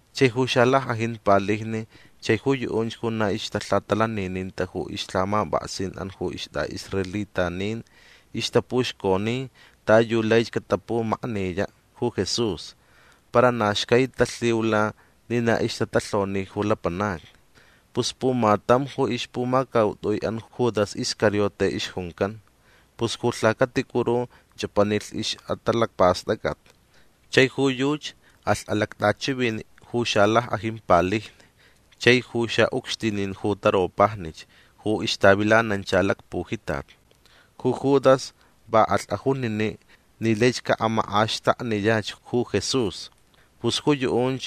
Chai ju xalack'ajin palijni chai ju yu'unch ju na ixtalhatalanininta ju ixlhamap'aksin'an ju ist'a'israelitanin ixtapuxconi ta yu laich catapumakniya' ju Jesús. Para na xcai talhiula ni na ixtatalhoni ju lapanacni. Pus pumatam ju ixpumacaut'ui'an Judas Iscariote ixjuncan. Pus ju lhacaticuru ch'apanilh ix'atalacpast'ac'at. Chai ju yuchi alh alact'achivini' ju xalack'ajin palijni chai ju xa'ucxtinin ju taropajnich ju ixtavilanancha lacpujitat. Ju Judas va alh ajunini' ni laich ca'amak'axtakniyach ju Jesús. Pus ju yu'unch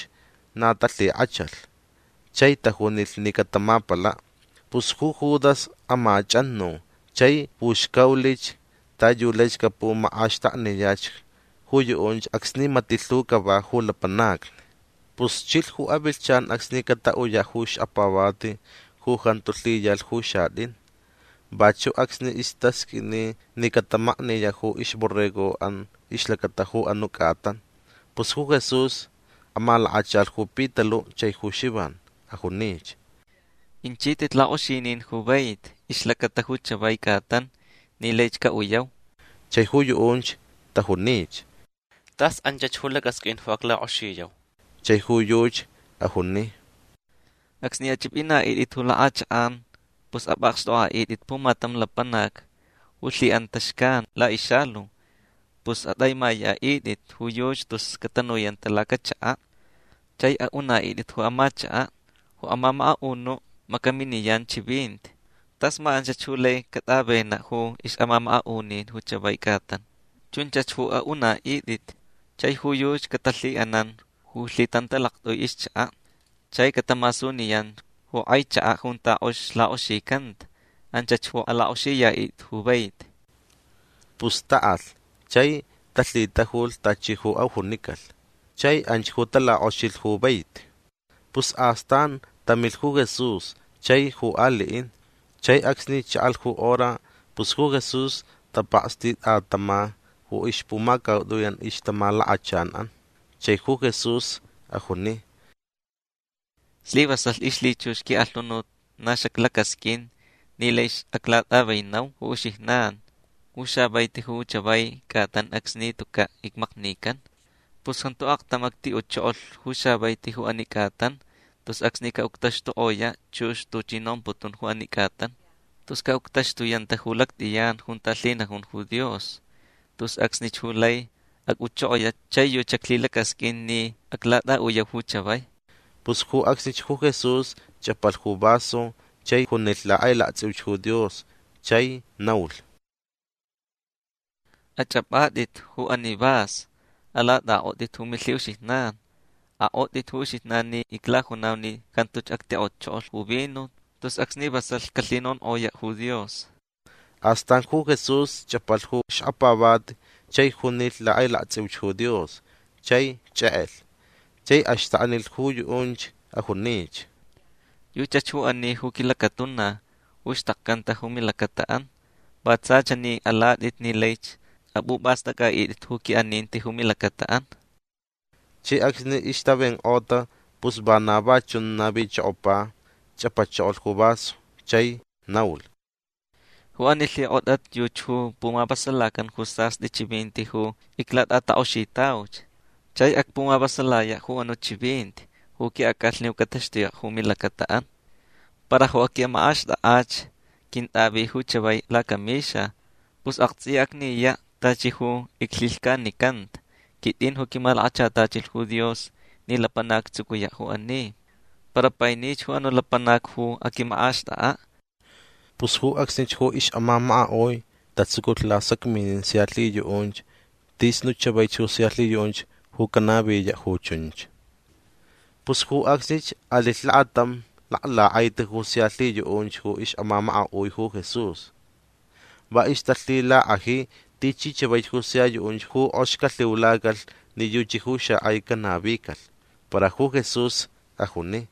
na talhik'achalh chai tajunilh ni catamapala'. Pus ju Judas amach'anu chai puxcaulich ta yu laich capumak'axtakniyach ju yu'unch acsni mati' lhu cava ju lapanacni. Pus chilh ju avilhchan acsni cata'uya' ju xkapavati ju jantu lhiyalh ju xat'in. Vachu' acsni istasq'uini ni catamakniya' ju ixborrego'an ixlacata ju anu' c'atan. Pus ju Jesús amalakachalh ju Pitalu' chai ju Xivan. Ajunich: ―Inchit'it lak'oxinin ju vaiti ixlacata ju chavai c'atan ni laich ca'uyau. Chai ju yu'unch tajunich: ―Tas anchach ju lac'asq'uin ju aclak'oxiyau. Chai ju yuchi ajuni: ―Acsni ach'ip'ina'it'it ju lak'achak'an pus ap'akxt'ok'a'it'it pumatam lapanac ju lhi'anta xcan la'ixalu. Pus at'aimaya'it'it ju yuchi tus catanuyanta ju lacachaka'. Chai a'una'it'it ju amachaka': “Ju amamaka'unu' macaminiyan chivinti. Tas ma anchach ju lai cat'avena' ju ix'amamaka'unin ju chavai c'atan”. Chunchach ju a'una'it'it. Chai ju yuchi catalhi'anan ju lhitantalact'ui ixchaka'. Chai catamasuniyan ju k'ai chaka' junta k'ox lak'oxicanta. Anchach ju alak'oxiya'it'it ju vaiti. Pus ta'alh chai talhitajulh tachi ju ajunicalh. Chai anch ju talak'oxilh ju vaiti. Pus astan tamilh ju Jesús chai ju ali'in. Chai acsni cha'alh ju hora pus ju Jesús tapakstit'atama ju ixpumacaut'ui'an ixtamalakachan'an. Chai ju Jesús ajuni: ―Slivasalh ixlhichux qui'alhunut na xaclacasq'uin ni laich aclat'avenau ju uxijnan ju xavaiti ju chavai c'atan acsni tuca' icmaknican. Pus jantu aktam acti'uchokolh ju xavaiti ju ani c'atan tus acsni ca'uctaxtuk'oya' chux tuchi nomputun ju ani c'atan. Tus ca'uctaxtuyanta ju lact'iyan junta lhinajun ju Dios. Tus acsnich ju lai ac'uchokoya' chai yuchi xaclhilacasq'uin ni aclat'a'uyau ju chavai. Pus ju acsnich ju Jesús ch'apalh ju vaso chai junilh lak'ailakts'iuch ju Dios chai naulh: ―Ach'ap'at'it ju ani vaso. Alat'ak'ot'it ju milhi'uxijnan. Ak'ot'it ju uxijnan ni iclajunau ni jantuch actik'otchokolh ju vino tus acsni vasalh calhinonk'oya' ju Dios. Astan ju Jesús ch'apalh ju xkapavati chai junilh lak'ailakts'iuch ju Dios. Chai ch'ek'elh. Chai axtaknilh ju yu'unch. Ajunich: ―Yuchach ju ani ju quilacatuna ju xtakcanta ju milacata'an. Va tsa chani alat'it ni laich ap'up'ast'ac'a'it'it ju qui'aninti ju milacata'an. Chai acsni ixtavenk'ota pus vana va chun navichokopa. Ch'apachokolh ju vaso chai naulh: ―Ju ani lhik'ot'at yuchi ju pumavasalacan ju sast'i chivinti ju iclat'atak'oxitauch. Chai acpumavasalaya' ju anu' chivinti ju qui'ac'alhni ju cataxtuya' ju milacata'an. Para ju aquimak'axt'ak'ach quint'avi ju chavai lacamixa. Pus akts'iya acniya' tachi ju iclhilhcanicanta. Quit'in ju quimalakachatachilh ju Dios ni lapanac actsucuya' ju ani. Para painich ju anu' lapanac ju aquimak'axt'ak'a'. Pus ju acsnich ju ix'amamaka'ui tatsuculh lasacminin sia lhiyu'unch tis nu' chavaich ju sia lhiyu'unch ju canaviya' ju chunch. Pus ju acsnich alilh lakatam laklak'aiti ju sia lhiyu'unch ju ix'amamaka'ui ju Jesús. Va ixtalhilak'aji tichi chavaich ju sia yu'unch ju k'ox calhiulacalh ni yuchi ju xak'ai canavicalh. Para ju Jesús ajuni: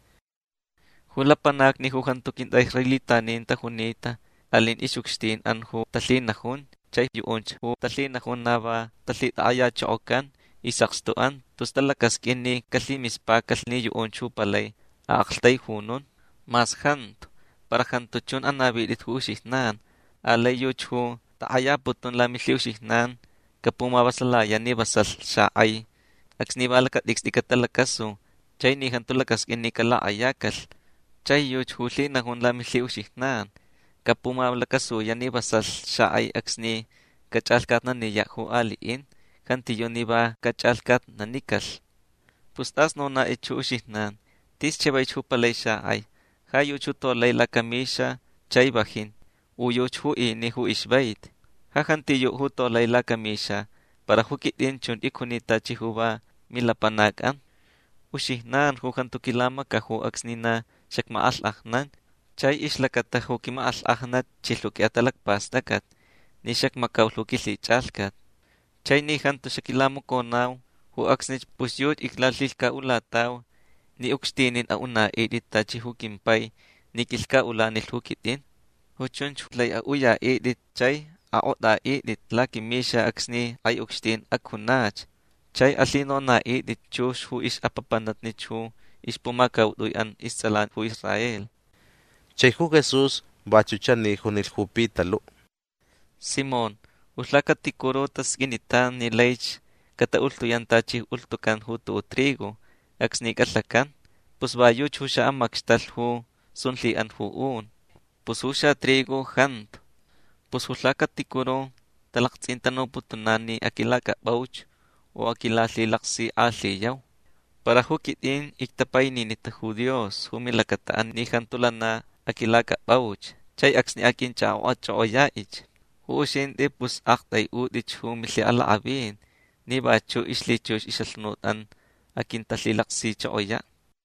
―Ju lapanacni ju jantu quint'a'israelitanin tajunita alin ix'ucxtin'an ju talhinajun. Chai yu'unch ju talhinajun na va talhitak'ayachokocan is'akstu'an tus talacasq'uin ni calhimispacalh ni yu'unch ju palai a'aktaijunun. Mas jantu. Para jantu chun anavit'it ju uxijnan. Alai yuchi ju tak'ayaputun lamilhi'uxijnan capumavasalaya' ni vasalh xak'ai acsni va lacat'icst'i catalacasu chai ni jantu lacasq'uin ni calak'ayacalh. Chai yuchi ju lhinajun lamilhi'uxijnan capumalacasuya' ni vasalh xak'ai acsni cach'alhcatnaniya' ju ali'in. Jantiyu' ni va cach'alhcatnanicalh. Pus t'as nonat'it ju uxijnan. Tis chavaich ju palai xak'ai. Ja yuchi ju tolai lacamixa chai vajin. U yuchi ju ini ju ixvaiti. Ja jantiyu' ju tolai lacamixa. Para ju quit'in chun icjunita tachi ju va milapanac'an. Uxijnan ju jantu quilamacaju acsni na xacmak'alhk'ajnan chai ixlacata ju quimak'alhk'ajnat chilh ju qui'atalacpast'ac'at ni xacmacaulh ju quilhich'alhcat. Chai ni jantu xaquilamaconau ju acsnich pus yuchi iclalhilhca'ulatau ni ucxtinin a'una'it'it tachi ju quimpai ni quilhca'ulanilh ju quit'in. Ju chunch lai a'uya'it'it chai ak'ot'a'it'it laquimixa acsni k'ai ucxtin acjunach. Chai alhinona'it'it chux ju ix'apapanatnich ju ixpumacaut'ui'an ists'alan ju Israel. Chai ju Jesús vachu' chani junilh ju Pitalu': ―Simón ju lhacaticuru tasq'uinitanch ni laich cata'ulhtuyan tachi ju ulhtucan ju tu'u' trigo acsni c'alhacan. Pus va yuchi ju xa'amacxtalh ju sun lhi'an ju un. Para ju xatrigo jantu. Pus ju lhacaticuru talakts'intanuputunan ni aquilac'ap'auch u aquilalhilaksik'alhiyau. Para ju quit'in ictapaininita ju Dios ju milacata'an ni jantu lana aquilac'ap'auch. Chai acsni aq'uinch'ak'ok'ach'ok'oya'ich ju uxint'i pus a'akt'ai'ut'ich ju milhi'alak'avin ni vachu' ixlhichux ix'alhunut'an aquintalhilaksichokoya'.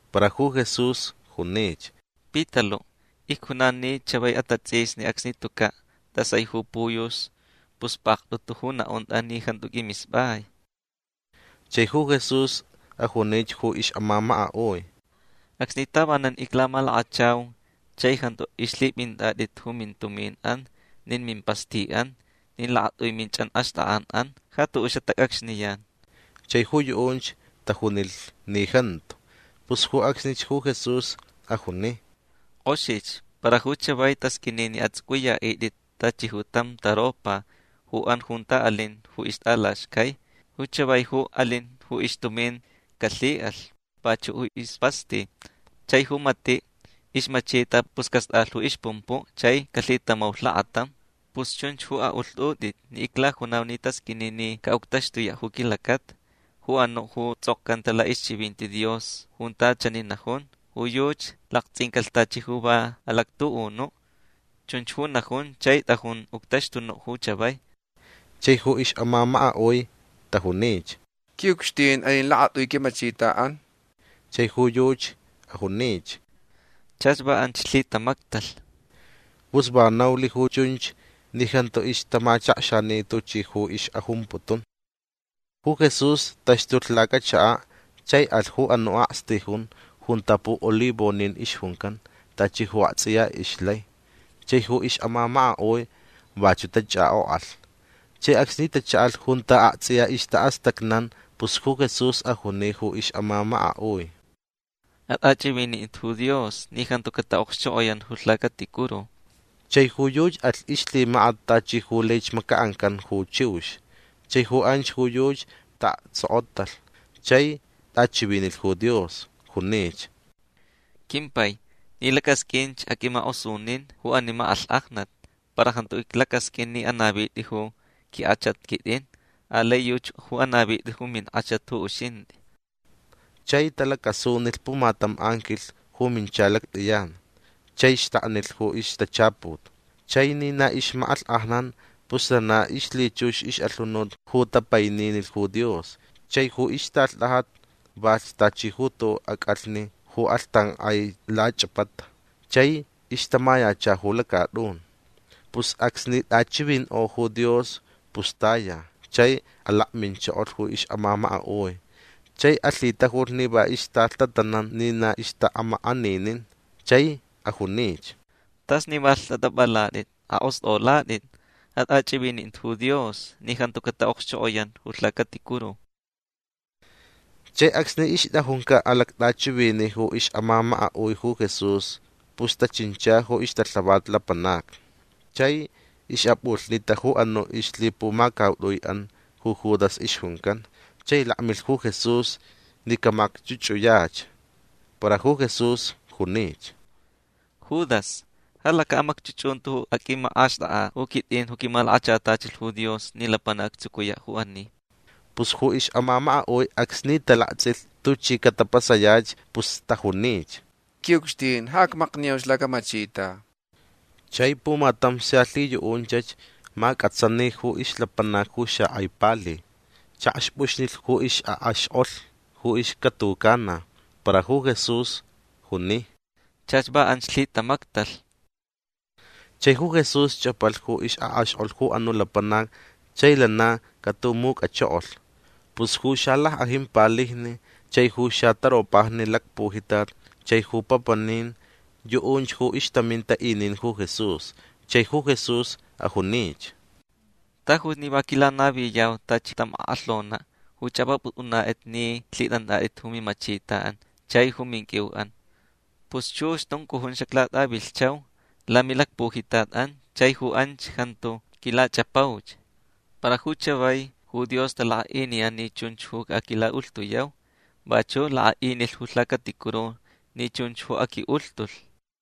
Para ju Jesús junich: ―Pitalu' icjunan ni chavai atats'isni acsni tuca' t'asai ju puyux pus pakt'utu ju na'unt'a ni jantu q'uimisp'ai. Chai ju Jesús ajunich ju ix'amamaka'ui: ―Acsni tavanan iclamalakachau chai jantu ixlhip'int'at'it ju mintumin'an nin mimpasti'an nin lakat'ui minch'anxt'ak'an'an ja tu'u' xatac'acxniyan. Chai ju yu'unch tajunilh ni jantu. Pus ju acsnich ju Jesús ajuni: ―K'oxich. Para ju chavai tasq'uini ni ats'uc'uya'it'it tachi tam taropa ju an junta alin ju ixt'alaxcai. Ju chavai ju alin ju ixtumin calhi'alh. Vachu' ju ispasti. Chai ju mati' ixmachita pus cast'alh ju ixpumpu' chai calhitamaulh lakatam. Pus chunch ju a'ulht'ut'it ni iclajunau ni tasq'uini ni ca'uctaxtuya' ju quilacata ju anu' ju ts'okcanta la'ixchivinti Dios junta chani najun: “Ju yuchi lakts'incalh tachi ju va alactu'unu'”. Chunch ju najun chai t'ajun uctaxtunu' ju chavai. Chai ju ix'amamaka'ui tajunich: ―Qui'ucxtin alin lakat'ui quimachita'an. Chai ju yuchi ajunich: ―Chach va anch lhitamactalh. Pus va naulh ju chunch ni jantu ixtamachakxani tuchi ju ix'ajumputun. Ju Jesús taxtulh lacachaka' chai alh ju anu' akstijun junta pu'olivonin ixjuncan tachi ju akts'iya ixlai. Chai ju ix'amamaka'ui vachu' tach'ak'ok'alh. Chai acsni tacha'alh junta akts'iya ixta'astacnan pus ju Jesús ajuni ju ix'amamaka'ui: ―At'ach'ivinint'it ju Dios ni jantu cata'okxchok'oyan ju lhacaticuru. Chai ju yuchi alh ixlhimakat tachi ju laich maca'ancan ju chiux. Chai ju anch ju yuchi ta'aktsokotalh chai t'achivinilh ju Dios. Junich: ―Quimpai ni lac'asq'uinch aq'uimak'osunin ju ani mak'alhk'ajnat. Para jantu iclacasq'uin ni anavit'i ju quink'achat quit'in. Alai yuchi ju anavit'i ju mink'achat ju uxint'i. Chai talacasunilh pumatam anquilh ju mincha lact'iyan chai xtaknilh ju ixtachaput. Chai ni na ixmak'alhk'ajnan pus lana ixlhichux ix'alhunut ju tapaininilh ju Dios. Chai ju ixtalht'ajat valhch tachi ju tu'u' ac'alhni ju k'alhtank'ai lach'apata chai ixtamayacha ju lacat'un. Pus acsni t'achivink'o ju Dios pus taya chai alakminchokolh ju ix'amamaka'ui. Chai alhitajulh ni va ixtalhtatanan ni na ixta'amak'aninin. Chai ajunich: ―T'as ni va lht'at'ap'alat'it. Ak'ost'olat'it. At'ach'ivinint'it ju Dios ni jantu cata'okxchok'oyan ju lhacaticuru. Chai acsni ixt'ajunca' alact'achivini' ju ix'amamaka'ui ju Jesús pus tachincha ju ixtalhavat lapanacni. Chai ix'ap'ulhnita ju anu' ixlhipumacaut'ui'an ju Judas ixjuncan. Chai lakmilh ju Jesús ni camacch'uch'uyach. Para ju Jesús junich: ―Judas ja laca'amacch'uch'unti ju aq'uimak'axt'ak'a' ju quit'in ju quimalakachatachilh ju Dios ni lapanac actsucuya' ju ani. Pus ju ix'amamaka'ui acsni talakts'ilh tuchi catapasayach pus tajunich: ―Qui'ucxtin ja acmakniyauch lacamachita. Chai pumatam sia lhiyu'unchach mac'atsani ju ixlapanac ju xak'ai pali. Chakxp'uxnilh ju ix'ak'axk'olh ju ixcatucana. Para ju Jesús juni: ―Chach va anch lhitamactalh. Chai ju Jesús ch'apalh ju ix'ak'axk'olh ju anu' lapanac chai lana catumuc'achokolh. Pus ju xalack'ajin palijni chai ju xataropajni lacpujitat chai ju papanin yu'unch ju ixtaminta inin ju Jesús. Chai ju Jesús ajunich: ―Tajuch ni va quilanaviyau tachi tam ak'alhona' ju ch'ap'ap'ut'unat'it ni lhit'ant'at'it ju mimachita'an chai ju minq'uiu'an. Pus chux tuncujun xaclat'avilhchau lamilacpujitat'an chai ju anch jantu quilach'apauch. Para ju chavai ju Dios talak'a'iniyan ni chunch ju aquila'ulhtuyau. Vachu' lak'a'inilh ju lhacaticuru ni chunch ju aqui'ulhtulh.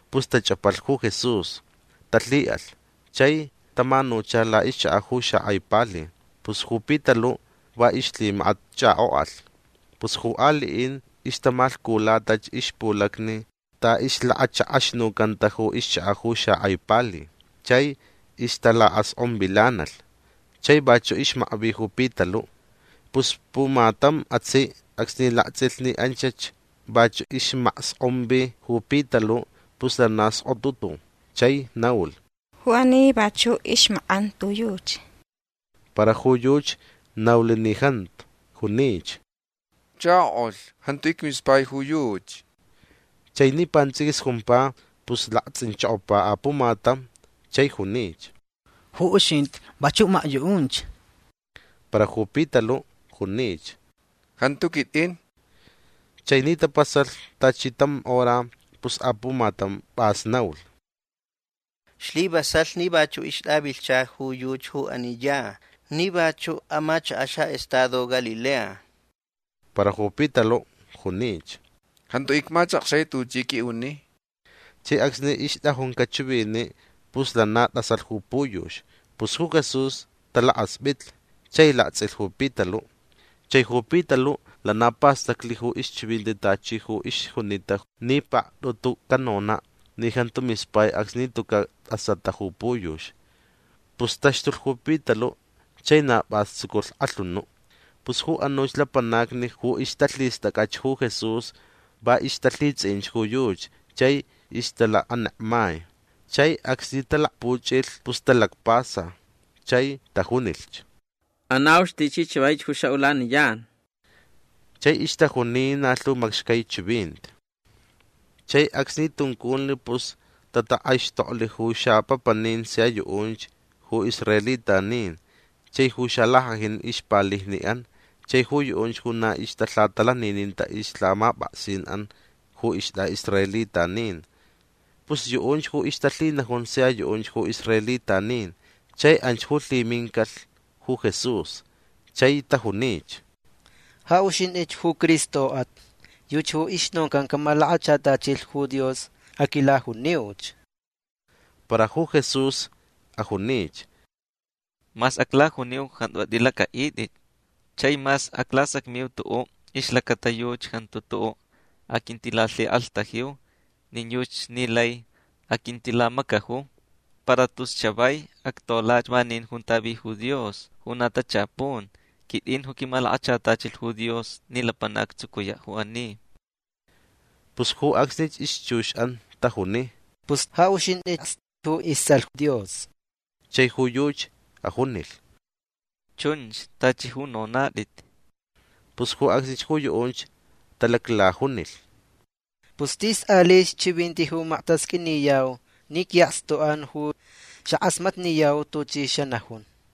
Pus tach'apalh ju Jesús. Talhi'alh chai tamanucha la'ixchaka' ju xak'ai pali. Pus ju Pitalu' va ixlhimakat ch'ak'ok'alh. Pus ju ali'in ixtamalhculatach ixpulacni ta ixlakachak'axnucanta ju ixchaka' ju xak'ai pali. Chai ixtalacsk'onvilanalh. Chai vachu' ixmakvi ju Pitalu'. Pus pumatam atsi' acsni lakts'ilh ni anchach vachu' ixmaksk'onvi ju Pitalu' pus lana sk'otutu chai naulh: ―Ju ani vachu' ixmak'anta ju yuchi. Para ju yuchi naulh ni jantu. Junich: ―Chako'ulh jantu icmispai ju yuchi. Chai ni pants'iquis jumpa pus lakts'inchokopa apumatam chai junich: ―Ju uxint'i vachu' makyu'unch. Para ju Pitalu' junich: ―Jantu quit'in. Chai ni tapasalh tachi tam hora pus apumatam p'as naulh: ―Slivasalh ni vachu' ixt'avilhcha ju yuchi ju ani ya ni vachuch amachaka' xa'estado Galilea. Para ju Pitalu' junich: ―Jantu icmachakxai tuch'i q'ui'uni. Chai acsni ixt'ajunca' chivini' pus lana t'asalh ju puyux. Pus ju Jesús talakasp'itlh chai lakts'ilh ju Pitalu'. Chai ju Pitalu' lana pastaclh ju ixchivinti tachi ju ixjunita ni pakt'utu canona' ni jantu mispai acsni tuca' t'asata ju puyux. Pus taxtulh ju Pitalu' chai na p'as tsuculh k'alhunu'. Pus ju anuch lapanacni ju ixtalhist'ac'ach ju Jesús va ixtalhits'i'inch ju yuchi chai ixtalakanekmai. Chai acsni talakpuch'ilh pus talacpasa chai tajunilhch: ―Anauch tichi chavaich ju xa'ulaniyan. Chai ixtajuni na lhu macxcai chivinti. Chai acsni tunculh pus tatak'aixtoklh ju xapapanin sia yu'unch ju israelitanin chai ju xalack'ajin ixpalijni'an chai ju yu'unch ju na ixtalhatalanininta ixlhamap'aksin'an ju ist'a'israelitanin. Pus yu'unch ju ixtalhinajun sia yu'unch ju israelitanin chai anch ju lhimincalh ju Jesús. Chai tajunich: ―Ja uxint'ich ju Cristo'at. Yuchi ju ixnoncan camalakachatachilh ju Dios. Aquilajuniuch. Para ju Jesús ajunich: ―Mas aclajuniu jantu at'ilac'a'it'it. Chai mas aclasacmiu tu'u' ixlacata yuchi jantu tu'u' aquintilalhik'alhtajiu nin yuchi ni lai aquintilamacaju. Para tus chavai actolach vanin junta vi ju Dios ju na tachapun. Quit'in ju quimalakachatachilh ju Dios ni lapanac actsucuya' ju ani. Pus ju acsnich ixchux'an tajuni: ―Pus ja uxint'i'as ju ists'alh Dios. Chai ju yuchi ajunilh: ―Chunch tachi ju nonat'it. Pus ju acsnich ju yu'unch talaclajunilh: ―Pus tis alich chivinti ju maktasq'uiniyau ni qui'akstuch'an ju xak'asmatniyau tuchi xanajun.